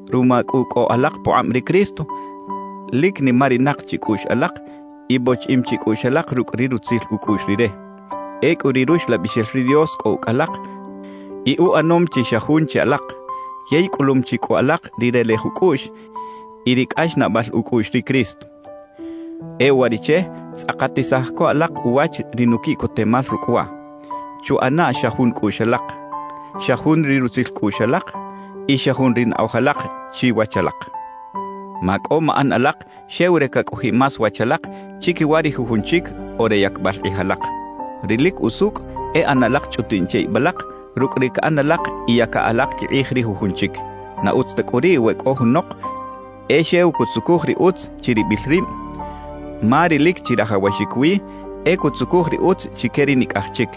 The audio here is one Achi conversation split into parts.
Ruma cꞌu cꞌo alak pukꞌab ri Cristo, lic nimarinak chi cꞌuꞌx alak y bochiꞌim chi cꞌuꞌx alak rucꞌ ri rutzil ucꞌuꞌx Rire. Ecꞌu ri Ruxlabixel ri Dios cꞌo ucꞌ alak y uꞌanom chi xa jun che alak, yey cꞌulum chi cꞌu alak ri relej ucꞌuꞌx y ri cꞌaxnaꞌbal ucꞌuꞌx ri Cristo. E uwariꞌche tzꞌakatisaj co alak uwach ri nuquiꞌcotemal rucꞌ waꞌ: Chuꞌana xa jun cꞌuꞌx alak, xa jun ri rutzil cꞌuꞌx alak y xa jun ri naꞌoj alak chiwach alak. Macꞌo maꞌan alak xew re cacꞌojiꞌ más wach alak chiquiwa ri jujun chic o re yacbal kꞌij alak. Ri lic usucꞌ e ꞌana alak chꞌutiꞌn che ib alak rucꞌ ri caꞌan alak y yaca alak quikꞌij ri jujun chic. Na utz ta cꞌu riꞌ we cꞌo junok e xew cutzucuj ri utz chiribil rib, ma ri lic chirajawaxic wi e cutzucuj ri utz chique ri nicꞌaj chic.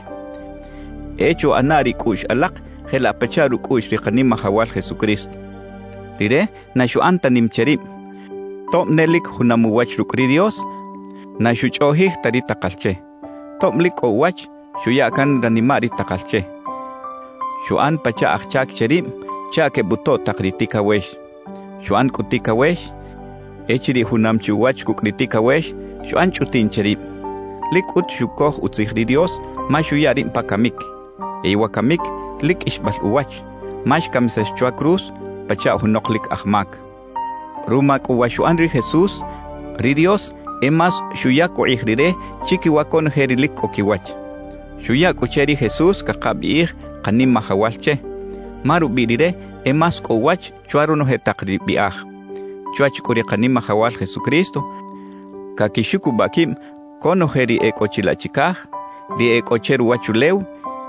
E chuꞌana ri cꞌuꞌx alak jelaꞌ pachaꞌ rucꞌuꞌx ri Kanimajawal Jesucristo. Rire na xuꞌan ta nim che rib; tob ne lic junam uwach rucꞌ ri Dios, na xuchꞌoꞌjij ta ri takal che. Tob lic cꞌo uwach, xuya can ranimaꞌ ri takal che; xuꞌan pachaꞌ aj chac che rib chaꞌ quebutoꞌ tak ri ticawex. Xuꞌan cꞌu ticawex. Echiriꞌ junam chi uwach cucꞌ ri ticawex, xuꞌan chꞌutiꞌn che rib. Lic cꞌut xucoj utzij ri Dios, ma xuya rib pa camic. Yey wa camic lic qꞌuixbal uwach, ma xcamisax chwa cruz pachaꞌ junok lic aj mac. Ruma cꞌu wa xuꞌan ri Jesús, ri Dios e más xuyac ukꞌij Rire chiquiwa conoje ri lic cꞌo quiwach. Xuya cꞌu che ri Jesús cakabiꞌij “Kanimajawal” che, ma rubiꞌ Rire e más cꞌo uwach chwa ronoje tak ri biꞌaj. Chwach cꞌu ri Kanimajawal Jesucristo caquixucubaꞌ quib conoje ri e cꞌo chilaꞌ chicaj, ri e cꞌo che ruwachulew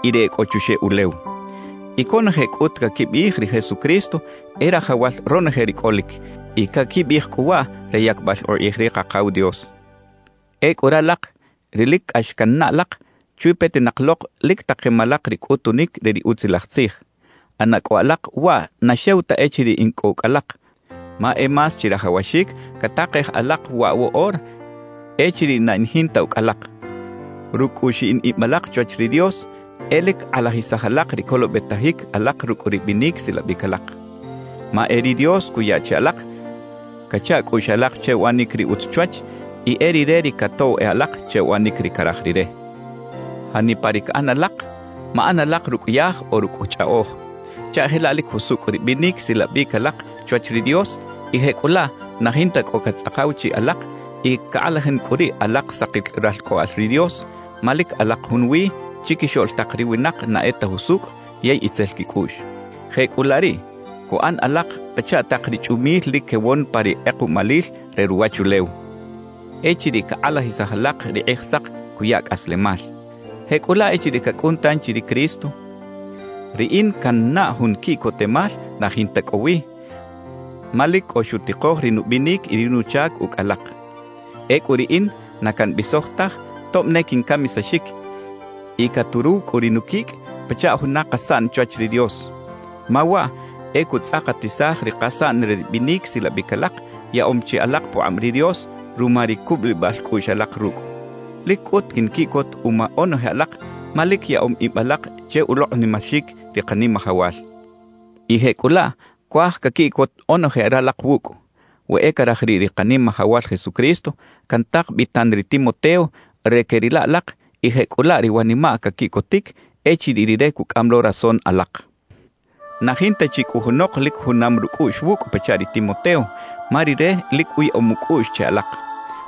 y ri e cꞌo chuxeꞌ ulew. Y conoje cꞌut caquibiꞌij “ri Jesucristo e Rajawal ronoje ri cꞌolic”, y caquibiꞌij cꞌu waꞌ re yacbal ukꞌij ri Kakaw Dios. Ecꞌu ralak, ri lic cꞌax cannaꞌ alak, chwi petinak lok, lic takem alak ri cꞌutunic re ri Utzilaj Tzij; ꞌana cꞌu alak waꞌ na xew ta echiriꞌ in cꞌo ucꞌ alak, ma e más chirajawaxic catakej alak waꞌ woꞌora echiriꞌ na in jinta ucꞌ alak. Rucꞌ cꞌu xiꞌin ib alak chwach ri Dios, e lic kꞌalajisaj alak ri colobetajic alak rucꞌ ri binic silabic alak. Ma e ri Dios cuya che alak cacha cꞌuꞌx alak che uꞌanic ri utz chwach y e Rire ri catoꞌw e alak che uꞌanic ri caraj Rire. Janipa ri caꞌan alak, maꞌan alak rucꞌ yaj o rucꞌ chꞌaꞌoj chaꞌ jelaꞌ lic jusucꞌ ri binic silabic alak chwach ri Dios y jecꞌulaꞌ na jinta cꞌo catzꞌakaw chiꞌ alak y cakꞌalajin cꞌu riꞌ alak sakil ralcꞌoꞌal ri Dios, ma lic alak junwi chiquixoꞌl tak ri winak na e ta jusucꞌ yey itzel quicꞌuꞌx. Jecꞌulaꞌ riꞌ, cuꞌan alak pachaꞌ tak ri chꞌumil lic quewon pa ri kꞌekuꞌmalil re ruwachulew echiriꞌ cakꞌalajisaj alak ri Kꞌijsak cuya cꞌaslemal. Jecꞌulaꞌ echiriꞌ cacꞌun tanchi ri Cristo, riꞌin cannaꞌ jun quiꞌcotemal na jinta cꞌo wi, ma lic cꞌo xutikoj ri nubinic y ri nuchac ucꞌ alak. Ecꞌu riꞌin na cambisoj taj tob ne quincamisaxic y caturuw cꞌu ri nuquicꞌ pachaꞌ juna kasaꞌn chwach ri Dios, ma waꞌ e cutzꞌakatisaj ri kasaꞌn re ri binic silabic alak yaꞌom chi alak pukꞌab ri Dios ruma ri cubulibal cꞌuꞌx alak rucꞌ. Lic cꞌut quinquiꞌcot uma onoje alak ma lic yaꞌom ib alak che ulokꞌnimaxic ri Kanimajawal. Y jecꞌulaꞌ cuaj caquiꞌcot onoje ralak wucꞌ. We e caraj riꞌ ri Kanimajawal Jesucristo, cantak bi tan ri Timoteo re queꞌrila alak y jecꞌulaꞌ ri wanimaꞌ caquiꞌcotic echiriꞌ rire cucꞌam lo rason alak. Na jinta chi cꞌu junok lic junam rucꞌuꞌx wucꞌ pachaꞌ ri Timoteo, ma rire lic uyaꞌom ucꞌuꞌx che alak.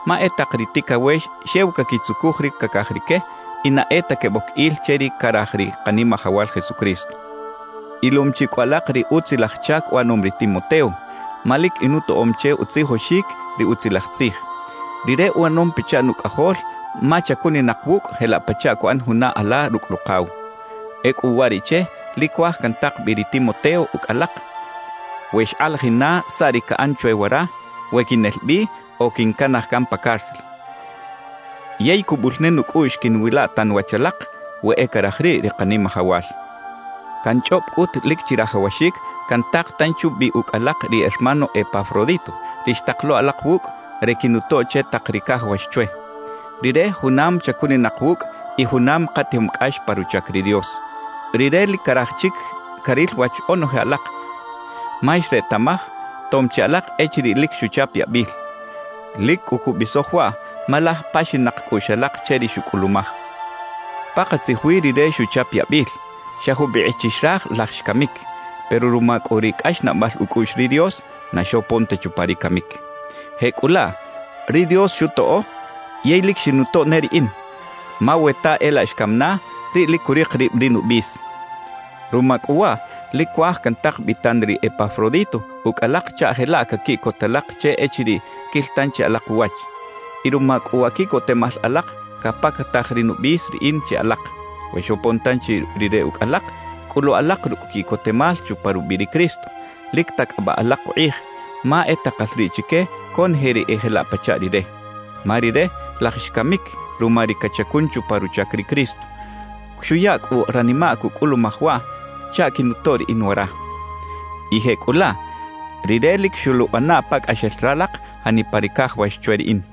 Ma e tak ri ticawex xew caquitzucuj ri cacaj rique y na e ta queboc il che ri caraj ri Kanimajawal Jesucristo. Ilom chi cꞌu alak ri utzilaj chac uꞌanom ri Timoteo, ma lic inutoꞌom che utzijoxic ri Utzilaj Tzij. Rire uꞌanom pachaꞌ nucꞌajol ma chacuninak wucꞌ jelaꞌ pachaꞌ cuꞌan juna ala rucꞌ rukaw. Ecꞌu uwariꞌche lic cuaj cantak bi ri Timoteo ucꞌ alak, we xkꞌalajin na saꞌ ri caꞌan chwe wara, we quinel bi o quincanaj pa cárcel. Yey cubul ne nucꞌuꞌx quiꞌnwila tan wach alak, we e caraj riꞌ ri Kanimajawal. Canchꞌob cꞌut lic chirajawaxic cantak tanchi ubi ucꞌ alak ri hermano Epafrodito, ri xtak lo alak wucꞌ re quinutoꞌ che tak ri cajawax chwe. Rire junam chacuninak wucꞌ y junam katijom cꞌax pa ruchac ri Dios. Rire lic caraj chic caril wach onoje alak, ma xretaꞌmaj tom chi alak echiriꞌ lic xuchap yabil. Lic cꞌu cubisoj waꞌ, ma laj paxinak cꞌuꞌx alak che ri xucꞌulumaj. Pakatzij wi rire xuchap yabil, xa jubikꞌ chi xraj laj xcamic, pero ruma cꞌu ri cꞌaxnaꞌbal ucꞌuꞌx ri Dios na xopon ta chupa ri camic. Jecꞌulaꞌ ri Dios xutoꞌo yey lic xinutoꞌ ne riꞌin, ma we ta e laꞌ xcam na, riꞌ lic curik rib ri nubis. Ruma cꞌu waꞌ lic cuaj cantak bi tan ri Epafrodito ucꞌ alak chaꞌ jelaꞌ caquiꞌcot alak che echiriꞌ quil tanchi alak uwach. Y ruma cꞌu wa quiꞌcotemal alak, capactaj ri nubis riꞌin che alak. We xopon tanchi rire ucꞌ alak, cꞌulu alak rucꞌ quiꞌcotemal chupa rubiꞌ ri Cristo. Lic tacꞌabaꞌ alak ukꞌij, ma e takal riꞌ chique conoje ri e jelaꞌ pachaꞌ rire. Ma rire laj xcamic ruma ri cachacun chupa ruchac ri Cristo; xuya cꞌu ranimaꞌ cucꞌulumaj waꞌ chaꞌ quinutoꞌ riꞌin wara. Y jecꞌulaꞌ, rire lic xoluꞌana pacꞌaxel ralak janipa ri cajawax chwe riꞌin.